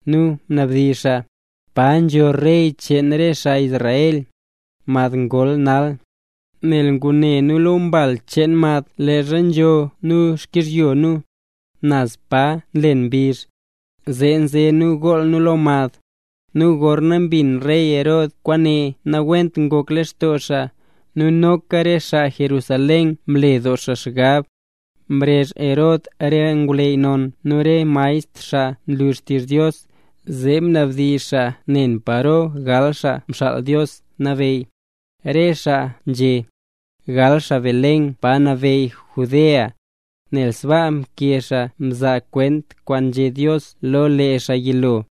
Nu mnabdizh xaa: —¿Pa nzho Rey cheen re xaa Israel, mad ngol nal? Nel ngune nu lo mbal cheen mad leezha mzo nu xkyizhyo nu, naz pa nlen mbizh, zee nze nu gool nu lo mad. Nu gorna mbin rey Herod kwaane nawent ngok lextoo xaa, nu noka re xaa Jerusalén mle doo xaa xgab. Mrezh Herod re ngwleyy non nu re maestr xaa nlu xtizh Dios, zee mnabdizh xaa nen paro gal Xaa Xaal Dios Nabeyy. Re xaa nzhé: —Gal xaa Belén pa nabeyy Judea; nel sbaa mkee xaa mzaa kwent kwaan nzhé Dios lo lee xaa yilo: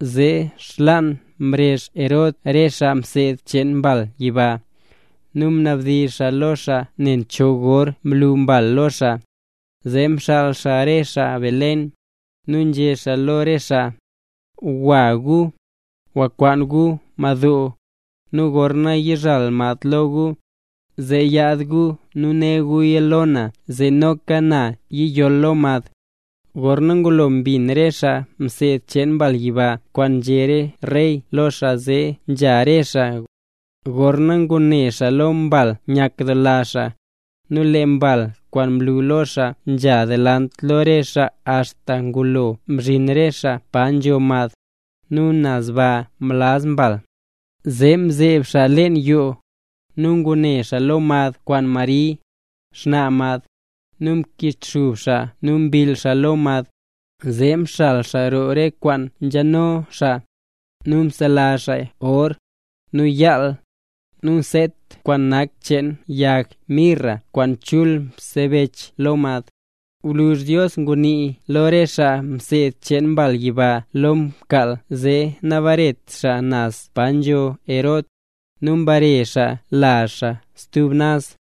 Zee xlaan mrezh Herod re xaa mseed cheen mbal yiba, nu mnabdizh xaa lo xaa nen cho gor mlu mbal lo xaa. Zee mxaal xaa re xaa Belén, nu nzhé xaa lo re xaa: —Gwa gu, gwakwaan gu madoo, nu gorna yizhal mad lo gu, zee yaad gu nu né guya lo na zee noka na yiyoll lo mad. Gorna ngulo mbin re xaa mseed cheen mbal yiba kwaan nzhé rey lo xaa zee nzha re xaa. Gorna ngune xaa lo mbal nyakdoola xaa. Nu lee mbal kwaan mlu lo xaa nzha delant lo re xaa axta ngulo mzhin re xaa pa nzho mad, nu naz baa mlaz mbal. Zee mzeeb xaa leen yoo, nu ngune xaa lo madoo kwaan Mari, xnaa mad. Nu mkichxub xaa nu mbill xaa lo mad, zee mxal xaa roo re kwaan nzhano xaa, nu mselazh xaa or, nu yaal, nu anseyt kwaan nak cheen yag mirra kwaan chul nzebech lo mad. Gwluzh Dios ngunii lo re xaa mseed cheen mbal yiba lo mkaal zee nabaret xaa naz pa nzho Herod, nu mbare xaa lazh xaa stub naz.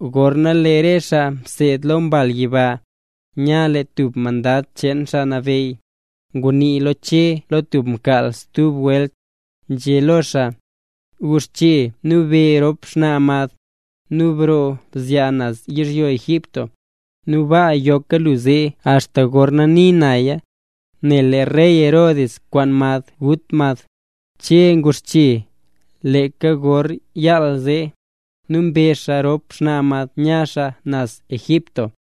Gorna lee re xaa mseed lo mbal yiba nya, lee tub mandad cheen Xaa Nabeyy, ngunii lo Che lo tub mkaal stub welt, nzhé lo xaa: —Guxche, nu be rop xnaa mad, nu broo zyaa naz yizhyo Egipto. Nu baa yoka lu zee, axta gorna nii naya, nel lee rey Herod kwaan mad gut xaa mad. Che nguxche, leeka gor yaal zee, nu mbe xaa rop xnaa mad nya xaa naz Egipto,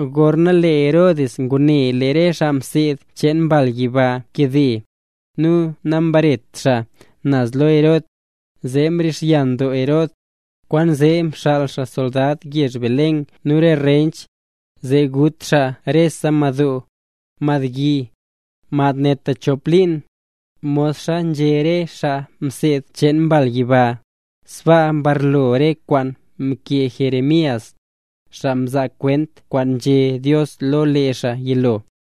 Gorna lee Herod ngune lee re xaa mseed cheen mbal yiba mkade, nu nambaret xaa naz lo Herod, zee mrixyan doo Herod. Kwaanzee mxaal xaa soldad yezh Belén nu re rench, zee gut xaa rese madoo, madbyi, mad neta chop liin, modxa nzhé re xaa nseed cheen mbal yiba. Sbaa mbarlo re kwaan mkee Jeremías, xaa mzaa kwent kwaan nzhé Dios lo lee xaa yilo: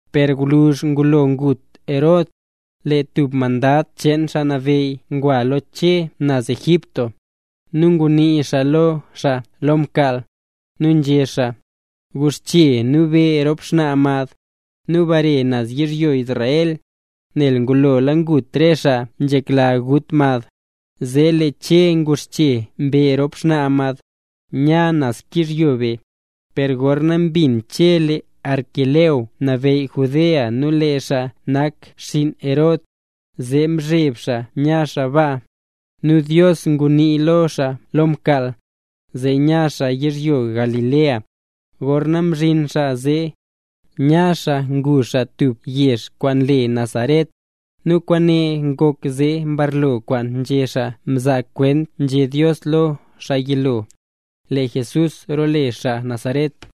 Per gwluzh ngulo ngut Herod, lee tub mandad cheen Xaa Nabeyy ngwa lo Che naz Egipto, nu ngunii xaa lo xaa lo mkaal, nu nzhé xaa: —Guxche, nu be rop xnaa mad, nu bare naz yizhyo Israel, nel ngulola ngut re xaa nzhekla gut mad. Zee lee Che nguxche mbe rop xnaa mad, nya naz xkyizhyo be. Per gorna mbin Che lee Arquelao nabeyy Judea nu lee xaa nak xinn Herod, zee mzheb xaa nya xaa baa. Nu Dios ngunii lo xaa lo mkaal, zee nya xaa yizhyo Galilea. Gorna mzhin xaa zee, nya xaa ngu xaa tub yezh kwaan le Nazaret. Nu kwaane ngok zee mbarlo kwaan nzhé xaa mzaa kwent kwaan nzhé Dios lo lee xaa yilo: “Lee Jesús role Xaa Nazaret”.